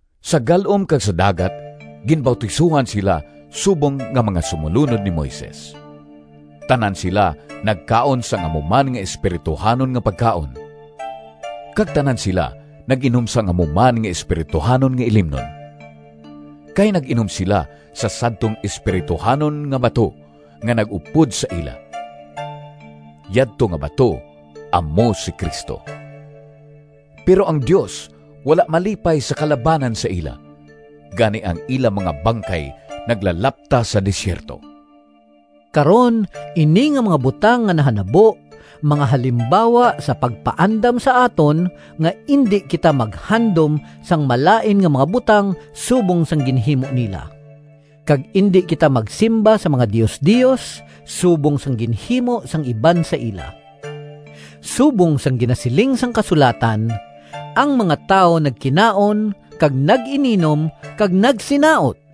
Sa gal-om kag sa dagat ginbautisohan sila subong nga mga sumolunod ni Moises. Tanan sila nagkaon sang amo man nga espirituhanon nga pagkaon, kag tanan sila nag-inom sang amo man nga espirituhanon nga ilimnon. Kay nag-inom sila sa sadtong espirituhanon nga bato nga nag-upod sa ila. Yadto nga bato amo si Cristo. Pero ang Dios wala malipay sa kalabanan sa ila, gani ang ila mga bangkay naglalapta sa desierto. Karon, ini nga mga butang nga nahanabo mga halimbawa sa pagpaandam sa aton nga indi kita maghandom sang malain nga mga butang subong sang ginhimo nila, kag indi kita magsimba sa mga diosdios, subong sang ginhimo sang iban sa ila. Subong sang ginasiling sang kasulatan, “Ang mga tawo nagkinaon kag nag-ininom kag nagsinaot.”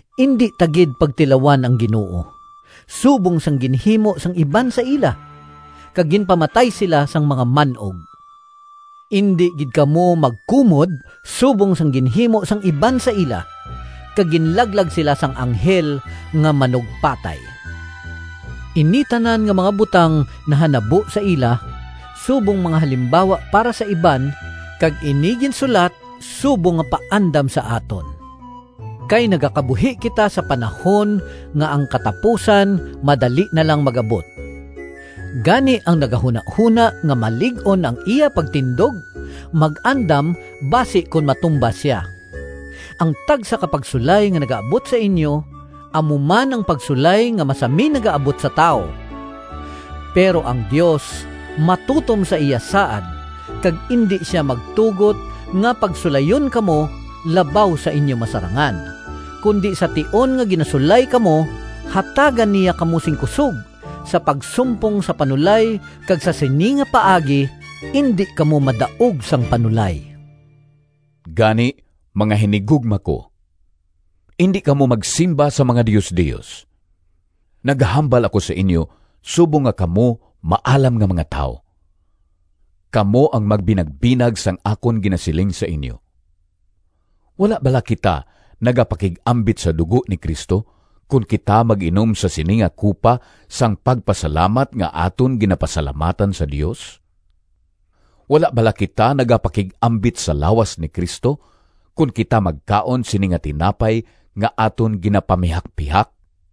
Indi ta gid pagtilawan ang Ginoo, subong sang ginhimo sang iban sa ila, kag ginpamatay sila sang mga man-og. Indi gid kamo magkumod subong sang ginhimo sang iban sa ila, kag ginlaglag sila sang Anghel nga Manugpatay. Ini tanan nga mga butang nahanabo sa ila subong mga halimbawa para sa iban, kag ini ginsulat subong nga paandam sa aton. Kay nagakabuhi kita sa panahon nga ang katapusan madali na lang mag-abot. Gani, ang nagahunahona nga malig-on ang iya pagtindog mag-andam basi kon matumba sia. Ang tagsa ka pagsulay nga nagaabot sa inyo amo man ang pagsulay nga masami nagaabot sa tawo. Pero ang Dios matutom sa iya saad kag indi sia magtugot nga pagsulayon kamo labaw sa inyo masarangan, kundi sa tion nga ginasulay kamo, hatagan niya kamo sing kusog sa pagsumpong sa panulay kag sa sini nga paagi indi kamo madaog sang panulay. Gani, mga hinigugma ko, indi kamo magsimba sa mga diosdios. Nagahambal ako sa inyo subong nga kamo maalam nga mga tawo. Kamo ang magbinagbinag sang akon ginasiling sa inyo. Wala bala kita nagapakig-ambit sa dugo ni Cristo kon kita mag-inom sa sini nga kupa sang pagpasalamat nga aton ginapasalamatan sa Dios? Wala bala kita nagapakig-ambit sa lawas ni Cristo kon kita magkaon sini nga tinapay nga aton ginapamihakpihak?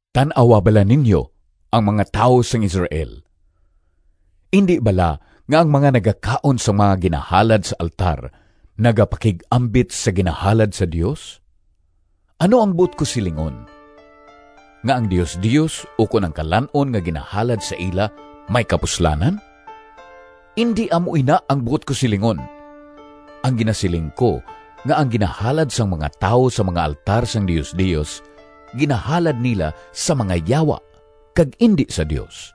Tan-awa bala ninyo ang mga tawo sang Israel. Indi bala nga ang mga nagakaon sang mga ginahalad sa altar nagapakig-ambit sa ginahalad sa Dios? Ano ang buot ko silingon? Nga ang diosdios ukon ang kalan-on nga ginahalad sa ila may kapuslanan? Indi amo ina ang buot ko silingon! Ang ginasiling ko nga ang ginahalad sang mga tawo sa mga altar sang diosdios ginahalad nila sa mga yawa kag indi sa Dios.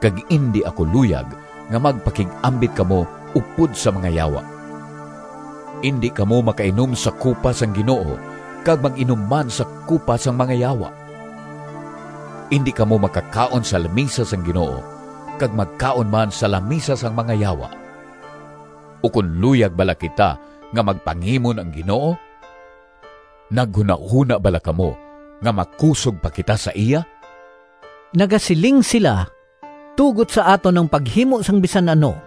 Kag indi ako luyag nga magpakig-ambit kamo upod sa mga yawa. Indi kamo makainom sa kupa sang Ginoo kag mag-inom man sa kupa sang mga yawa. Indi kamo makakaon sa lamisa sang Ginoo kag magkaon man sa lamisa sang mga yawa. Ukon luyag bala kita nga magpangimon ang Ginoo? Naghunahona bala kamo nga makusog pa kita sa iya? Nagasiling sila, “Tugot sa aton ang paghimo sang bisan ano.”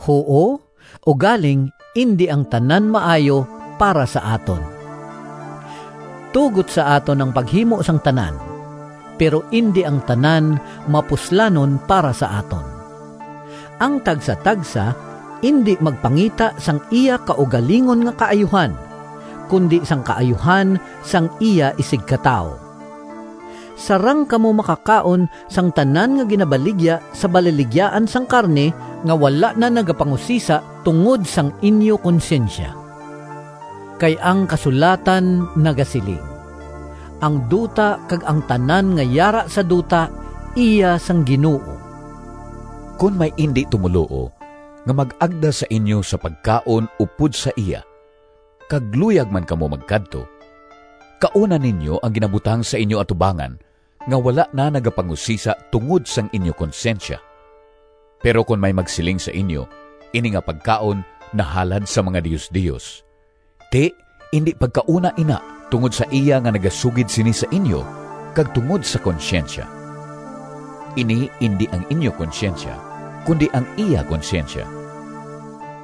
Huo, ugaling indi ang tanan maayo para sa aton. “Tugot sa aton ang paghimo sang tanan,” pero indi ang tanan mapuslanon para sa aton. Ang tagsatagsa indi magpangita sang iya kaugalingon nga kaayuhan, kundi sang kaayuhan sang iya isigkatawo. Sarang kamo makakaon sang tanan nga ginabaligya sa balaligyaan sang karne, nga wala na nagapangusisa tungod sang inyo konsyensya. Kay ang kasulatan nagasiling, “Ang duta kag ang tanan nga yara sa duta iya sang Ginoo.” Kon may indi tumoluo nga mag-agda sa inyo sa pagkaon upod sa iya kag luyag man kamo magkadto, kauna ninyo ang ginabutang sa inyo atubangan nga wala na nagapangusisa tungod sang inyo konsyensya. Pero kon may magsiling sa inyo, “Ini nga pagkaon nahalad sa mga diosdios,” ti indi pagkauna ina tungod sa iya nga nagasugid sini sa inyo kag tungod sa konsyensya— ini indi ang inyo konsyensya, kundi ang iya konsyensya.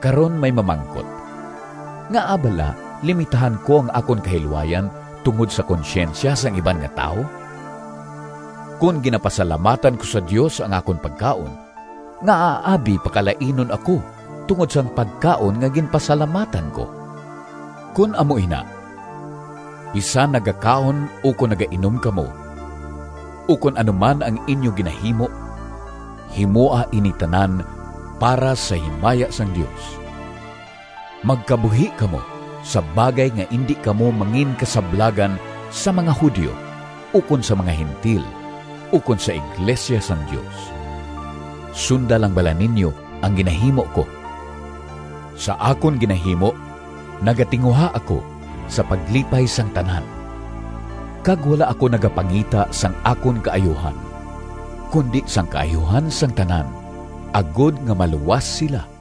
Karon may mamangkot, “Ngaa bala limitahan ko ang akon kahilwayan tungod sa konsyensya sang iban nga tawo? Kon ginapasalamatan ko sa Dios ang akon pagkaon, ngaa abi pakalainon ako tungod sang pagkaon nga ginpasalamatan ko?” Kon amo ina, bisan nagakaon ukon nagainom kamo, ukon ano man ang inyo ginahimo, himoa ini tanan para sa himaya sang Dios. Magkabuhi kamo sa bagay nga indi kamo manginkasablagan sa mga Judio ukon sa mga Gentil ukon sa iglesia sang Dios. Sunda lang bala ninyo ang ginahimo ko. Sa akon ginahimo nagatinguha ako sa paglipay sang tanan, kag wala ako nagapangita sang akon kaayuhan, kundi sang kaayuhan sang tanan, agod nga maluwas sila.